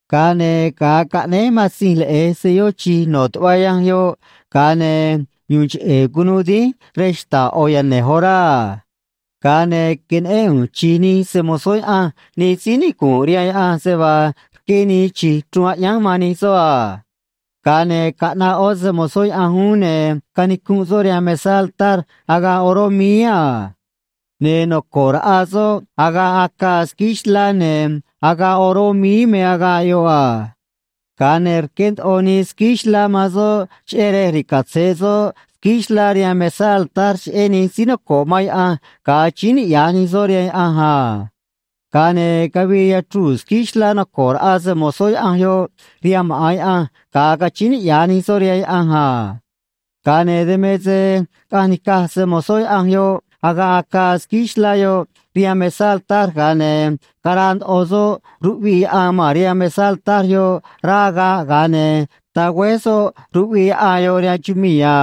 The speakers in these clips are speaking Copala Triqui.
Ga̱a ne̱ ga̱a caꞌnéj Matzinj Leꞌe̱j selló chi̱j no̱ tuꞌva yanj yoꞌ, ga̱a ne̱ yu̱u̱n cheꞌe̱ cunuu dínj rej xta̱ꞌ ꞌo̱ yane̱j orá a. Ga̱a ne̱ queneꞌén ꞌu̱nj chi̱j nij se‑mo̱zó Yaꞌanj nij síí nicu̱nꞌ rihaan Yaꞌanj, se vaa rqué nii chi̱j chruun aꞌyánj man nij soꞌ a. Ga̱a ne̱ caꞌnaꞌ ꞌó se‑mo̱zó Yaꞌanj uún, ne̱ canicunꞌ soꞌ rihaan mesá altar agaꞌ oró míí a. Ne̱ noco̱ꞌ raꞌa soꞌ agaꞌ acaa squíí xlá, ne̱ agaꞌ oró míí me agaꞌ yoꞌ a. Ga̱a ne̱ rqué ndoꞌo nii squíí xlá man soꞌ cheꞌé rej ri̱catzeꞌ soꞌ squíí xlá rihaan mesá altar cheꞌé nij síí noco̱ꞌ man Yaꞌanj ga̱a achíín niꞌya̱j nij soꞌ rihaan Yaꞌanj a. Ga̱a ne̱ cavii yachruu̱ squíí xlá noco̱ꞌ raꞌa se‑mo̱zó Yaꞌanj yoꞌ rihaan maꞌa̱n Yaꞌanj, ga̱a cachíín niꞌya̱j nij soꞌ rihaan Yaꞌanj a. Ga̱a ne̱ dan me se caꞌanj nica̱j se‑mo̱zó Yaꞌanj yoꞌ agaꞌ acaa squíí xlá yoꞌ rihaan mesá altar, ga̱a ne̱ caraa ndoꞌo soꞌ ruꞌviꞌ yaꞌan ma̱n rihaan mesá altar yoꞌ rá agaꞌ, ga̱a ne̱ tagüéj soꞌ ruꞌviꞌ yaꞌan yoꞌ rihaan chumii̱ a.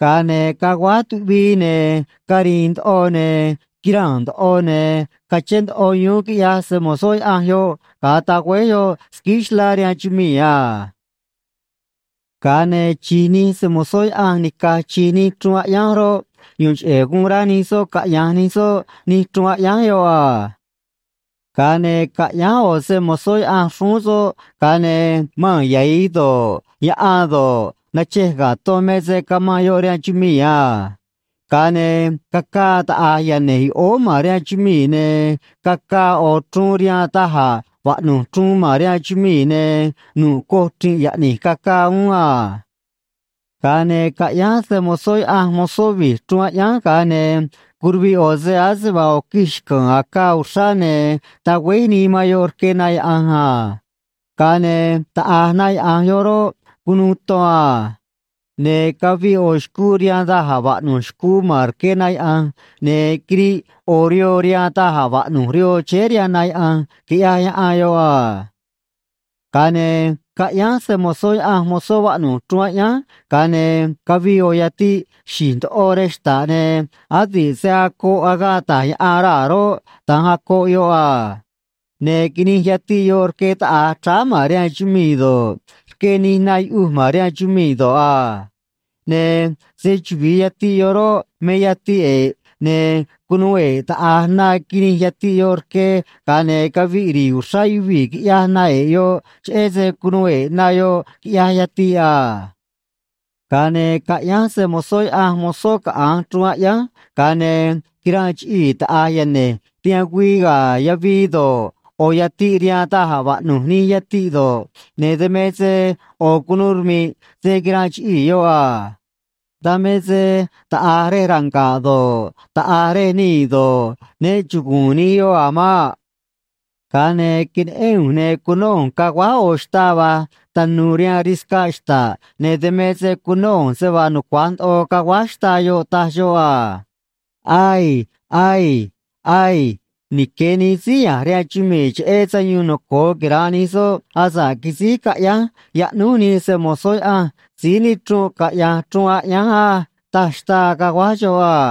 Ga̱a ne̱ caguáj tuꞌvii, ne̱ cari̱i̱n ndoꞌo, ne̱ quiraa̱n ndoꞌo, ne̱ cachén ndoꞌo yuún, quiꞌyaj se‑mo̱zó Yaꞌanj yoꞌ ga̱a tagüéj yoꞌ squíí xlá rihaan chumii̱ a. Ga̱a ne̱ chi̱j nij se‑mo̱zó Yaꞌanj nica̱j chi̱j nij chruun aꞌyánj roꞌ, yu̱u̱n cheꞌe̱ guun rá nij soꞌ caꞌya̱nj nij soꞌ nij chruun aꞌyánj yoꞌ a. Ga̱a ne̱ caꞌyánj ꞌo̱ se‑mo̱zó Yaꞌanj xrúún soꞌ, ga̱a ne̱ maa̱n yahi̱j do̱ꞌ, yaꞌan do̱ꞌ, nachej ga̱ ton me se camanꞌ yoꞌ rihaan chumii̱ a. Ga̱a ne̱ cacaa taꞌa̱j yane̱j yoꞌóó ma̱n rihaan chumii̱, ne cacaa ꞌo̱ chruun rihaan da̱j a̱ vaꞌnu̱j chruun ma̱n rihaan chumii̱, ne̱ nu̱ꞌ coj chri̱nꞌ yaꞌni̱j cacaa uún a. Ga̱a ne̱ caꞌyánj se‑mo̱zó Yaꞌanj mozó vi̱j chruun aꞌyánj, ga̱a ne̱ curuviꞌ ꞌo̱ se ase vaa ꞌo̱ quij xca̱a̱n acaa uxrá, ne̱ tagüéj nii man yoꞌ rque na yaꞌa̱nj a. Ga̱a ne̱ taꞌa̱j na yaꞌa̱nj yoꞌ roꞌ, cunuu ton a. Ne̱ caviꞌ ꞌo̱ xcuu rihaan da̱j a̱ vaꞌnu̱j xcuu ma̱n rque na yaꞌa̱nj, ne̱ quiriꞌ ꞌo̱ rihoo rihaan da̱j a̱ vaꞌnu̱j rihoo chéé rihaan na yaꞌa̱nj, quiꞌyaj yaꞌan yoꞌ a. Ga̱a ne̱ caꞌyánj se‑mo̱zó Yaꞌanj mozó vaꞌnu̱j chruun aꞌyánj, ga̱a ne̱ cavii ꞌo̱ yatiꞌ xi̱j ndoꞌo rej xta̱ꞌ, ne̱ adi̱ꞌ se acoꞌ agaꞌ ta̱j yaꞌan raa̱ roꞌ, da̱nj acoꞌ yoꞌ a. Ne̱ quinij yatiꞌ yoꞌ rque taꞌa̱j chráá ma̱n rihaan chumii̱ do̱ꞌ, rque nij na yuꞌuj ma̱n rihaan chumii̱ do̱ꞌ a. Ne̱ se‑chuvi̱i yatiꞌ yoꞌ roꞌ, me Yatiꞌ E̱ꞌ, ne̱ cunuu e̱ꞌ taꞌa̱j na quinij yatiꞌ yoꞌ rque, ga̱a ne̱ caviꞌ ri̱i̱ uxrá yuvii̱, quiꞌyaj na e̱ꞌ yoꞌ, cheꞌé se cunuu e̱ꞌ na yoꞌ, quiꞌyaj yatiꞌ a. Ga̱a ne̱ caꞌyánj se‑mo̱zó Yaꞌanj mozó caꞌa̱nj chruun aꞌyánj, ga̱a ne̱ quiranꞌ chiꞌii̱ taꞌa̱j yane̱j rihaan güii ga̱ yavii do̱ꞌ, ꞌo̱ yatiꞌ rihaan da̱j a̱ vaꞌnu̱j nij yatiꞌ do̱ꞌ, ne̱ dan me se ꞌo̱ cunu̱u rmi̱ꞌ se quiranꞌ chiꞌii̱ yoꞌ a. Dan me se taꞌa̱j rej ranga̱ꞌ do̱ꞌ, taꞌa̱j rej nii̱ do̱ꞌ, ne chugu̱u̱n nij yoꞌ a̱ maꞌ. Ga̱a ne̱ queneꞌén ꞌu̱nj, ne̱ cunó ꞌu̱nj caguáj ꞌo̱ xtaa va̱j tanu̱u̱ rihaan riscaꞌ xta̱ꞌ, ne̱ dan me se cunó ꞌu̱nj se vaa nucua̱j ndoꞌo caguáj xtaa yoꞌ, taj xoꞌ a: ―Aii. Aii. Aii. Nique̱ nij síí ya̱nj rihaan chumii̱ cheꞌé sayuun noco̱o quira̱nꞌ nij soꞌ asa̱ꞌ quisíj caꞌyánj yaꞌnúj nij se‑mo̱zó Yaꞌanj síí nichrunꞌ caꞌya̱nj chruun aꞌyánj á ―taj xtaa, caguáj xoꞌ a.